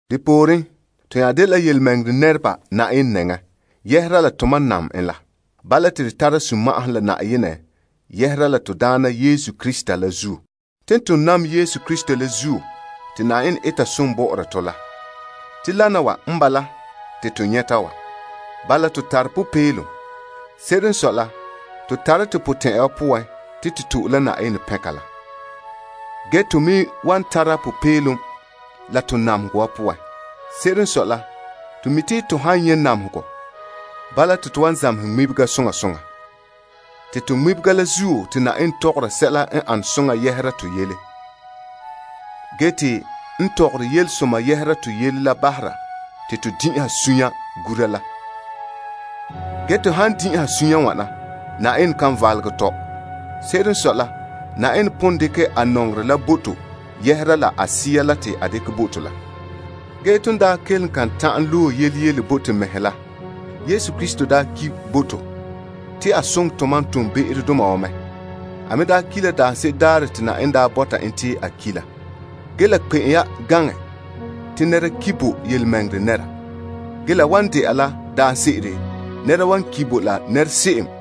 Depooren, to nya dela tontɔɔ nɛreba Yenɛ nɛŋan dɔla la tomam nam Yenɛ la. Bala te to tara sunma'ahom la Yenɛ doohe to Daana Yesu Krista poan. Ton nam Yesu Krista la zuo te Yenɛ eta som bɔ'ɔra tɔ. Dene n bala te to nyɛta wa. Bala to tare popeelom. Se'ere n sɔe la to tare potɛn'ɛrɛ te to wan lagom to'e Yenɛ pɛnka la. Ge me tara popeelom to namehegɔ wa poan. Se'ere n sɔe la, to mi' te to han nyɛ' namehegɔ, bala to wan zamehɛ ŋmibega soŋa soŋa. To ŋmibega la zuo te Yenɛ tɔgɔra sɛla n ane soŋa yɛhera to yele. Ge ton tɔgɔrɛ yelesoma yɛhera to yele la bahere te to din'inhe suunre gura. Ge to han din'inhe suunre wana, Yenɛ kan valegɛ tɔ. Se'ere n sɔe la, Yenɛ pon dekɛ a nɔŋerɛ la bo to yɛhera la a Sea la te a dekɛ bo to la. Ge ton daa kelom kan ta'an loe yele yele bo to mɛhe la. Yesu Krista daa ki bo to te a soŋɛ tomam toonbe'erodoma wa mɛ. A ki' la daanse'ere daarɛ te Yenɛ bɔta n te a ki la. La kpe'em ya te nɛra ki bo tontɔɔ nɛra. Ge la wan de'a la daanse'ere nɛra wan ki bo la nɛresoŋɔ.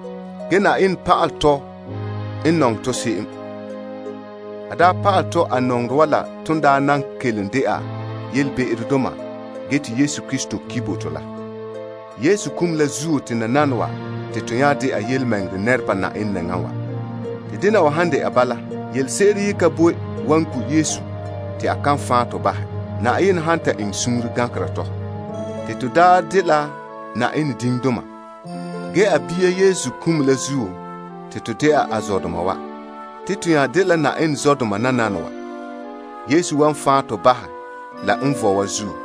Yenɛ pa'alɛ tɔ, en nɔŋɛ tɔ se'em. A pa'alɛ tɔ a nɔŋerɛ wa la ton nan kelom dɛna yelebe'erodoma te Yesu Krista ki bo to. Yesu kum la zuo te nananawa te to nya dɛna tontɔɔ nɛreba Yenɛ nɛŋan. Te dena wa han dɛna bala, yelese'ere ka boe wan gu' Yesu te a kan fan' tɔ bahɛ, Yenɛ han ta eŋɛ suunre gankera tɔ. To daa dela Yenɛ diŋdoma. Ge a bia Yesu kum la zuo, te to dɛna a zɔdoma wa. Ton nya dela Yenɛ zɔdoma. Yesu wan fan' to bahɛ la n vɔe wa zuo.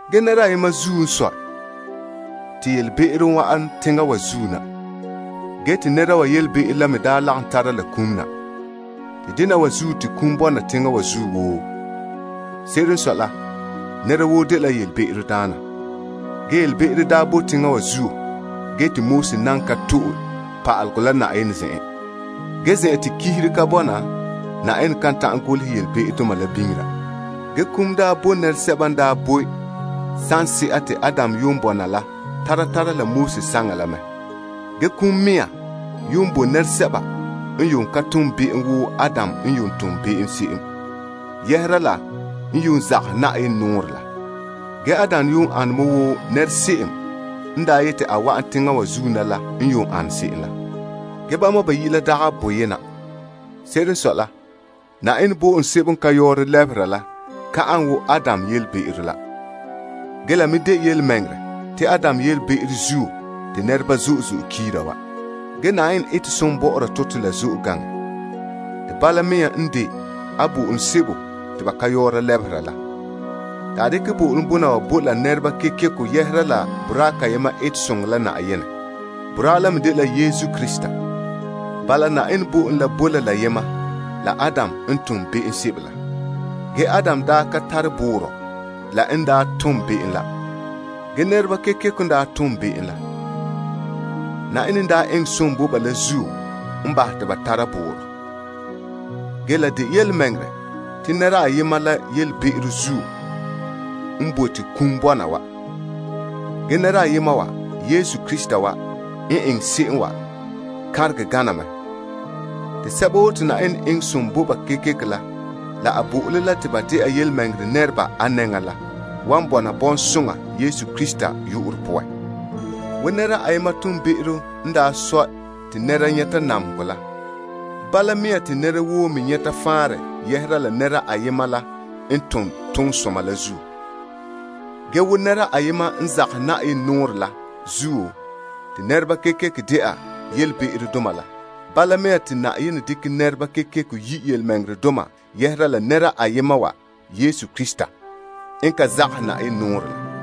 Tɔ. Nɛra ayema zuo te be'em wa'an teŋa wa zuo na. Te nɛra wa be'em la n tare kum na. Te dena wa zuo te kum bɔna teŋa wa zuo woo. Se'ere n sɔe la nɛra woo dela be'emdaana. Ge be'em daa pon bɔna teŋa wa zuo te Yenɛ nan ka bo pa'alegɔ la. Ge zen'an te pa'alegɔ la ka bɔna, ba kan nyɛ be'em. Ge kum daa boe nɛresɛba n daa boe saŋsɛka te Adam yuun bɔna la tara tara la Moses saŋa la mɛ. Kum mea yuun boe nɛresɛba n yuun ka tom be'em wo Adam n yuun tom se'em, yɛhera la n yuun zagahɛ Yenɛ nɔɔrɛ la. Ge Adam yuun ane mɛ wo nɛra se'em n daa yeti a wa'an teŋa wa zuo na la n yuun ane se'em la. Ge bama bayi' la dagɛ boyena. Se'ere n sɔe la, Yenɛ zaŋa bo'olom la ka ane wo Adam yelebe'ero la. Ge la me de yelemɛŋɛrɛ te Adam yelebe'ero zuo te nɛreba kiira wa. Ge Yenɛ n zo'ohogɔ la zo'e gaŋɛ mɛ, te bala mea me n de a zaŋa bo'olom la. A dekɛ bo'olom bona wa bo la nɛreba kekeko yɛhera la boraa kayema som la zuo te Yenɛ dekɛ bo to. Boraa wa dela Yesu Krista. Bala Yenɛ bo'olom la boe la boyema, la Adam n tom be'em se'em la. Ge Adam daa ka tare boorɔ la en tom be'em la. Nɛreba kekeko n daa tom be'em la. Yenɛ n daa eŋɛ som bo ba la zuo n bahɛ ba te ba tara boorɔ. Ge la de yelemɛŋɛrɛ te nɛra ayema la be'em zuo n bahɛ te kum bɔna wa. Ge nɛra ayema wa, Yesu Krista wa n eŋɛ se'em wa kanregɛ gaŋɛ mɛ. Te sɛba woo te Yenɛ zo'ohɛ ba la a bo'olom te ba dɛna tontɔɔ nɛreba a nɛŋan la, wan bɔna bɔŋsoŋa Yesu Krista yu'urɛ poan. Bala zuo nɛra yene be'em n bahɛ te nɛra woo nyɛta namehegɔ la, bala mea te nɛra woo me nyɛta faanrɛ yɛhera la nɛra yene toonsoma la zuo. Bala zuo nɛra yene n zagahɛ Yenɛ nɔɔrɛ la zuo te nɛreba dɛna be'emdoma, bala mea te Yenɛ yi' nɛreba tontɔɔdoma yɛhera la nɛra yene Yesu Krista wa, n ka zagahɛ Yenɛ nɔɔrɛ la zuo.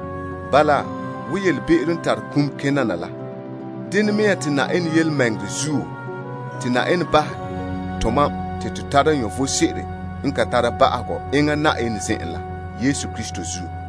Bala, be'em n tare kum na la, bala mea te Yenɛ zo'ohogɔ la bahɛ tomam te to tara vom sebo n ka tare ba'ahegɔ enŋa Yenɛ zen'en la to Daana Yesu Krista zuo.